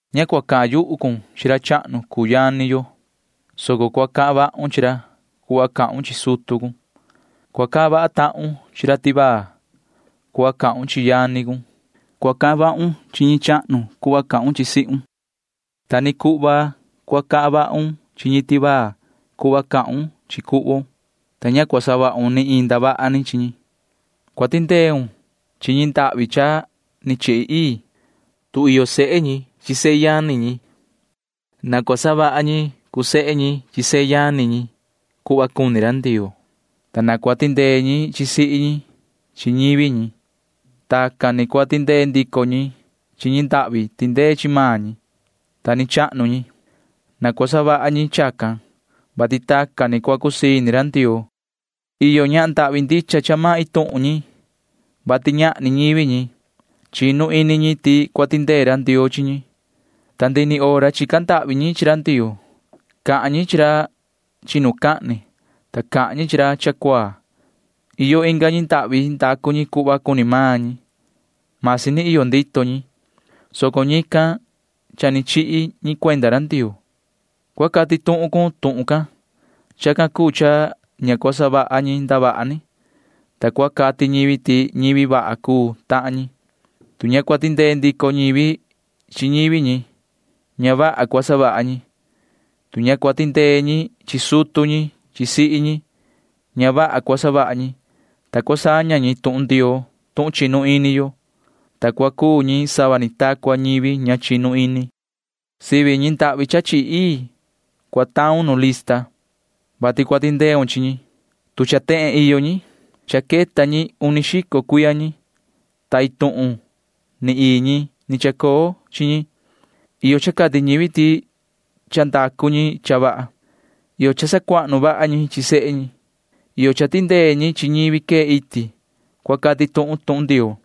Ña cua cahan yuhu cun chi ra chahnu cuu yani yo, soco cua cahan vahun chi ra cuhva cahun chi sutu cun. Cua cahan vaha tahun chi ra tivaa cuhva cahun chi yani cun. Cua cahan vahun chi ñi chahnu cuhva cahun chi sihun. Ta ni cuhva cua cahan vahun chi ñi tivaa cuhva cahun chi cuhvon, ta ña cua savahun ni iin ndavaha ni chi ñi. Cua tindeun chi ñi ndahvi cha ni chihi ii. Tu iyo sehe ñi chi sehe yani ñi, na cua savaha ñi cuu sehe ñi chi sehe yani ñi cuhva cuni ra Ndioo, ta na cua tindee ñi chi sihi ñi chi ñivi ñi. [Tacan ni cua tindee ndico ñi chi ñi ndahvi tindee chi maan ñi, ta ni chahnu ñi.] Na cua savaha ñi chacan, vati tacan ni cua cusii ini ra Ndioo. Iyo ñahan ndahvi ndicha cha maan iin tuhun ñi, vati ñahni ñivi ñi. Chinu ini ñi ti cua tindee ra Ndioo chi ñi, ta ndihi ni hora chica ndahvi ñi chi ra Ndioo. Cahan ñi chi ra chinucahni, ta cahan ñi chi ra cha cuaa. Iyo inga ñi ndahvi ndacu ñi cuhva cuni maan ñi. Masi ni iyo ndito ñi, soco ñican cha ni chihi ñi cuenda ra Ndioo. Cua cati tuhun cun tuhun can. Chacan cuu cha ña cua savaha ñi ndavaha ni, ta cua cati ñivi ti ñivi vaha cuu tahan ñi. Tu ña cua tindee ndico ñivi chi ñivi ñi, ña vaha cua savaha ñi. Tu ña cua tindee ñi chi sutu ñi chi sihi ñi, ña vaha cua savaha ñi, ta cua saña ñi tuhun Ndioo tuhun chinu ini yo, ta cua cuu ñi sava ni ta cua ñivi ña chinu ini. Sivi ñi ndahvi cha chihi ii cua taun nu lista, vati cua tindeun chi ñi, tu cha tehen iyo ñi. Cha queta ñi uni xico cuiya ñi, ta iin tuhun ni ii ñi ni chacoo chi ñi. Iyo cha cati ñivi ti cha ndacu ñi cha vaha. Iyo cha sacuahnu vaha ñi chi sehe ñi. Iyo cha tindee ñi chi ñivi quee iti cua cati tuhun tuhun Ndioo.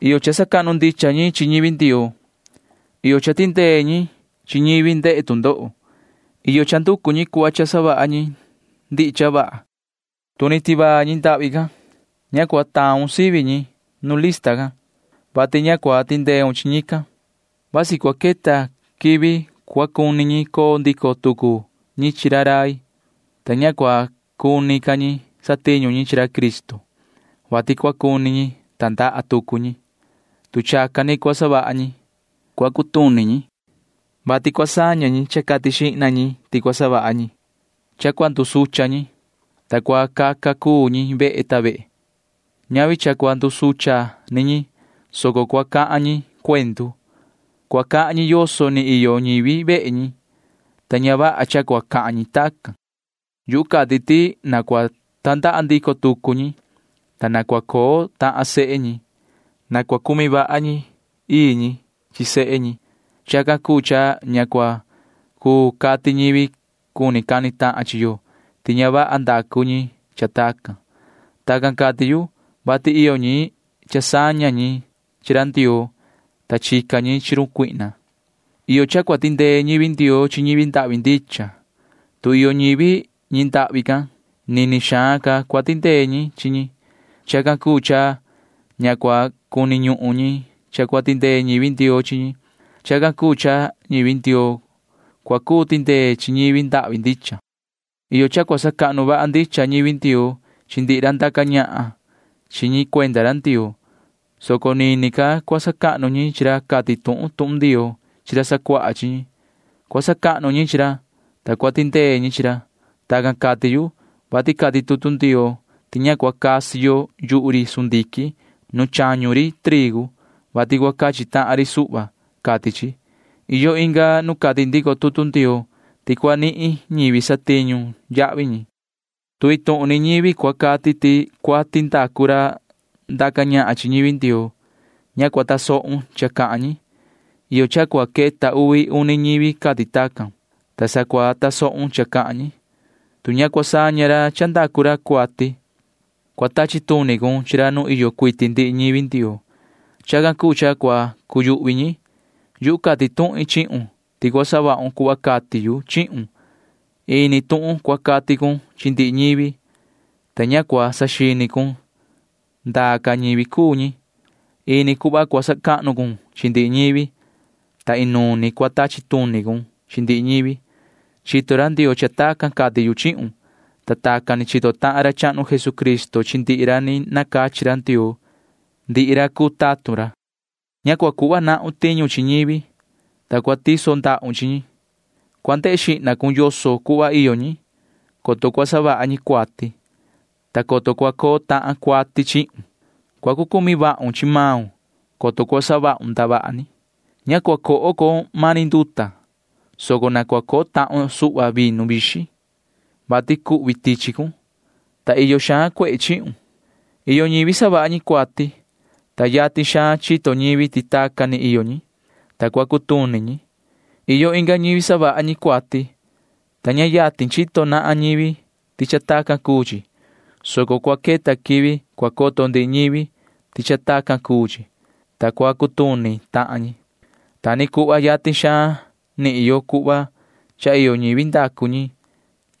Iyo cha sacahnu ndicha ñi chi ñivi Ndioo. Iyo cha tindee ñi chi ñivi ndehe tu ndoho. Iyo cha nducu ñi cuhva cha savaha ñi ndihi cha vaha. Tu ni tivaa ñi ndahvi can, ña cua taun sivi ñi nu lista can, [vati ña cua tindeun chi ñican]. Vasi cua queta quivi cua cuni ñi coo ndico tucu ñi chi ra rai, ta ña cua cuni ca ñi satiñu ñi chi ra Cristo, vati cua cuni ñi tandaha tucu ñi. Tu chacan ni cua savaha ñi, cua cutuni ñi, vati cua saña ñi cha cati xihna ñi ti cua savaha ñi. Cha cua ndusucha ñi, ta cua caca cuu ñi vehe ta vehe. Ñavi cha cua ndusucha ni ñi, soco cua cahan ñi cuendu. Cua cahan ñi yoso ni iyo ñivi vehe ñi, ta ña vaha cha cua cahan ñi tacan. Yuhu cati ti na cua tandaha ndico tucu ñi, ta na cua coo tahan sehe ñi. Na cua cumi vaha ñi chi ii ñi chi sehe ñi. Chacan cuu cha ña cua cuu cati ñivi cuni cani tahan chi yo ti ña vaha ndacu ñi cha tacan. Tacan cati yu, vati iyo ñi cha saña ñi chi ra Ndioo, ta chica ñi chi run Satanaa. Iyo cha cua tindee ñivi Ndioo chi ñi ndahvi ndicha. Tu iyo ñivi ñi ndahvi can, nini xaan ca cua tindee ñi chi ñi. Chacan cuu cha ña cua cuni ñuhun ñi cha cua tindee ñivi Ndioo chi ñi. Chacan cuu cha ñivi Ndioo cua cuu tindee chi ñivi ndahvi ndicha. Iyo cha cua sacahnu vaha ndicha ñivi Ndioo chi ndihi ra ndaca ñahan chi ñi cuenda ra Ndioo, soco nini ca cua sacahnu ñi chi ra cati tuhun tuhun Ndioo chi ra sacuaha chi ñi. Cua sacahnu ñi chi ra, ta cua tindee ñi chi ra. Tacan cati yu, vati cati tutu Ndioo ti ña cua casi yo yuhu ri sundiquin nu chañu ri trigu, vati cua cachi tahan ri suhva, cati chi. Iyo inga nu cati ndico tutu Ndioo ti cua nihin ñivi satiñu yahvi ñi. Tu iin tuhun ni ñivi cua cati ti cuati ndacu ra ndaca ñahan chi ñivi Ndioo, ña cua tasohun cha cahan ñi. Iyo cha cua queta uvi uni ñivi cati tacan, ta sa cua tasohun cha cahan ñi. Tu ña cua saña ra cha ndacu ra cuati, cua tachi tuni cun chi ra nu iyo cuiti ndihi ñivi Ndioo. Chacan cuu cha cua cuyuhvi ñi. Yuhu cati tuhin chihun ti cua savahun cuhva cati yu chihun. Ini tuhun cua cati cun chi ndihi ñivi, ta ña cua saxini cun ndaa ca ñivi cuu ñi. [Ini cuhva cua sacahnu cun chi ndihi ñivi, ta inuun ni cua tachi tuni cun chi ndihi ñivi.] Chito ra Ndioo cha tacan cati yu chihun, ta tacan ni chito tahan ra chahnu Jesucristo chi ndihi ra ni nacachi ra Ndioo, ndihi ra cuu tatun ra. Ña cua cuhva nahun tiñu chi ñivi, ta cua tiso ndahun chi ñi. Cua ndehe xihna cun yoso cuhva iyo ñi, coto cua savaha ñi cuati, ta coto cua coo tahan cuati chihun. Cua cu cumi vahun chi maun, coto cua savahun ndavaha ni. Ña cua coho con mani nduta, soco na cua coho tahun suhva vinu vixin, vati cuhvi tichi cun, ta iyo xaan cuehe chihun. Iyo ñivi savaha ñi cuati, ta yatin xaan chito ñivi ti tacan ni iyo ñi, ta cua cutuni ñi. Iyo inga ñivi savaha ñi cuati, ta ña yatin chito nahan ñivi ti cha tacan cuu chi, soco cua queta quivi cua coto ndihi ñivi ti cha tacan cuu chi, [ta cua cutuni tahan ñi]. Ta ni cuhva yatin xaan nihin yo cuhva cha iyo ñivi ndacu ñi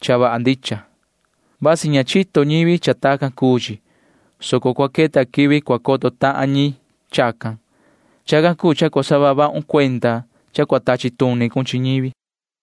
cha vaha ndicha. Vasi ña chito ñivi ti cha tacan ni cuu chi, soco cua queta quivi cua coto tahan ñi chacan. [Chacan cuu cha cua saha vahun cuenda cha cua tachi tuni cun chi ñivi.]